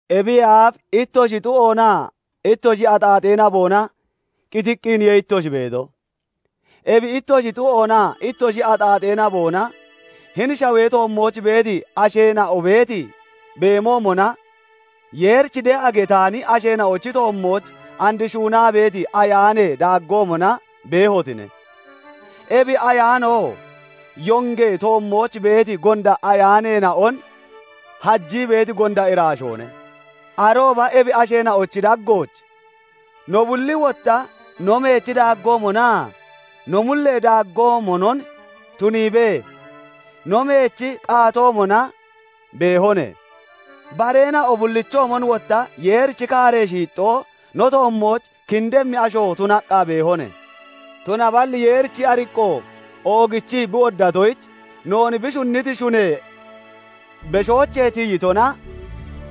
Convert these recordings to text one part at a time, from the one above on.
Ebiyee aaf ittoshi xuu'oonaa ittoshi axaaxee naboona qitiqqiniye ittoshi beeto; ebi ittoshi xu'oonaa ittoshi axaaxee naboona hini shawee toommooch beeti asheena'o beeti beemoomona, Yeerich de'a getaani asheena'ochi toommooch and shuunaa beeti ayaanee daaggoomona beehotine; ebi ayaanoo yongee toommooch beeti gonda ayaaneena'on hajii beeti gonda iraashoone. Arooba ebi asheena'ochi daggooch no bulli wotta no meechi daaggoomonaa no mullee daaggoomonon tuniibee, no meechi qaatoomona beehone; bareena'o bullichoomon wotta Yeerichi kaaree shiixxoo no toommooch kindemmi asho tunaqqa beehone; tunaballi Yeerichi ariqqo oogichii bi woddatoyich, noon bi shunniti shunee beshoochee tiyitona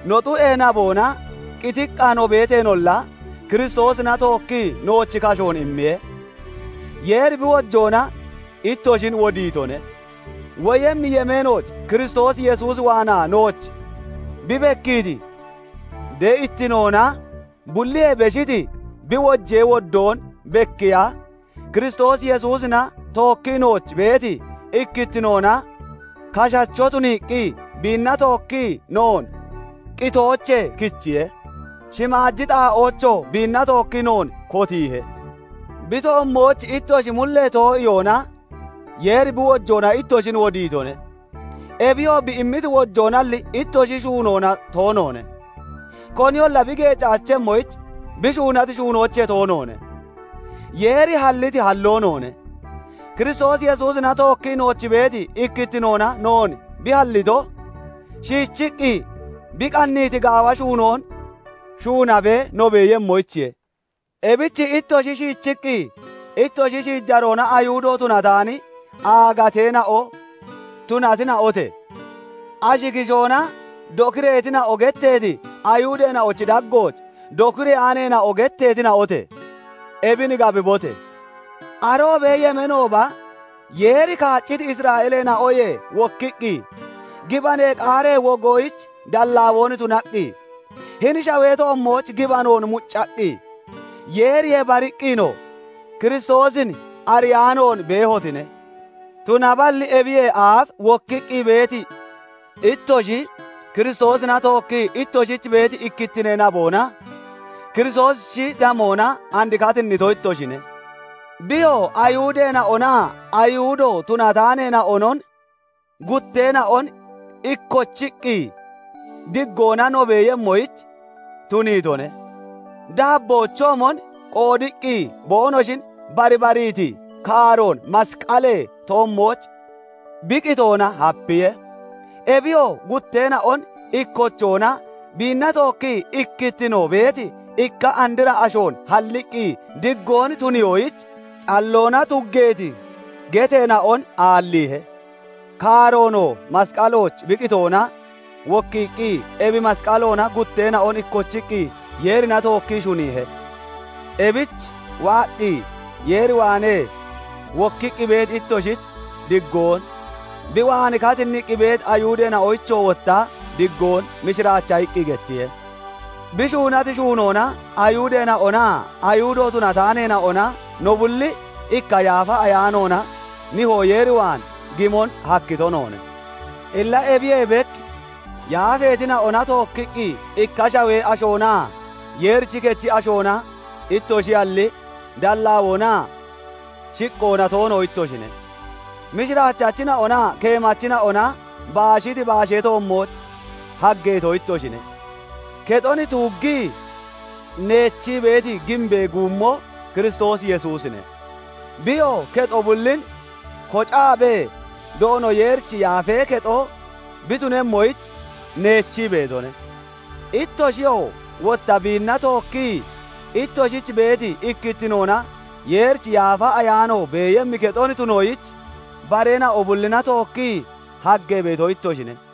no xu'ee naboona qitiqqa no beeteenolla, Kiristoosina tookkii nooch kashoon immiye; Yeeri bi wojoona ittoshin wodiitone. Woyemmi yemeenooch Kiristoos Yesuus waanaa nooch bi bekkiiti de'ittinoona bulliyee beshiti bi wojee woddoon bekiiya, Kiristoos Yesuusina tookkii nooch beeti ikkittinoona kashacho tuniiqqi biinna tookkii noon qitoochee kichiye; shimaaji xaa'oochoo biinna tookkii noon kotiihe. Bi toommooch ittoshi mullee too'iyoona Yeeri bi wojoona ittoshin wodiitone; ebiyoo bi immiti wojoonalli ittoshi shuunoona toonoone; koniyolla bi geecaachemmoyich bi shuunati shuunoochee tooneene. Yeeri halliti halloo noone; Kiristoos Yesuusina tookkii nooch beeti ikkittinoona noon bi hallito, shiichiqqi bi qanniiti gaawa shuunoon shuunabee no beeyemmoyichiye. Ebich ittoshi shiichiqqi ittoshi shiijaroona Ayihudo tunataani aagateena'o tunatina'ote! Ashi kishoona dokireetina'o getteeti Ayihudeena'ochi daggooch dokireyaaneena'o getteetina'ote! Ebin gabibote! Aroobee yemeenooba, Yeeri kaacciti Isra'eeleena'oyee wokkiqqi, gibanee qaaree wogoyich dallaawoon tunaqqi, hini shawee toommooch gibanoon muccaqqi, Yeeriyee bariqqinoo Kiristoosin ariyaanoon beehotine; tunaballi ebiyee aaf wokkiqqi beeti ittoshi, Kiristoosina tookkii ittoshich beeti ikkittinee naboona, Kiristoosichi damoona and katinnito ittoshine. Biyoo Ayihudeena'onaa Ayihudo tunataaneena'onon gutteena'on ikkochiqqi diggoona no beeyemmoyich tuniitone; daabboochoomon qoodiqqi boonoshin barbariiti kaaroon masqalee toommooch bi qitoona hapiye; ebiyoo gutteena'on ikkochoona biinna tookkii ikkittino beeti ikka andra ashoon halliqqi, diggoon tuniyoyich, calloona tuggeeti geteena'on aalliihe. Kaaroonoo masqalooch bi qitoona wokkiiqqi ebi masqaloona gutteena'on ikkochiqqi Yeerina tookkii shuniihe. Ebich waaqqi Yeer waanee wokkiqqi beeti ittoshich diggoon, bi waan katinniqqi beeti Ayihudeena'oyichoo wotta diggoon mishiraacha iqqi gettiye; bi shuunati shuunoona Ayihudeena'onaa Ayihudo tunataaneena'ona no bulli ikka Yaafa Ayaanoona Nihoo Yeer waan gimon hakkito noone. Illa ebiyee bek yaafeetina'ona tookkiqqi ikka shawee ashoonaa Yeerichi kechi ashoona ittoshiyalli, dallaawoonaa shiqqoona toono ittoshine. Mishiraachachina'onaa keemachina'ona baashiti baashee toommooch haggeeto ittoshine; kexon tuuggii neechii beeti giimbee guumoo Kiristoos Yesuusine; biyoo kexo bullin kocaabee Doono Yeerichi Yaafee Kexo bi tunemmoyich neechii beetone; ittoshiyoo wotta biinna tookkii ittoshich beeti ikkittinoona Yeerichi Yaafa Ayaano beeyemmi kexon tunoyich bareena'o bullina tookkii haggee beeto ittoshine.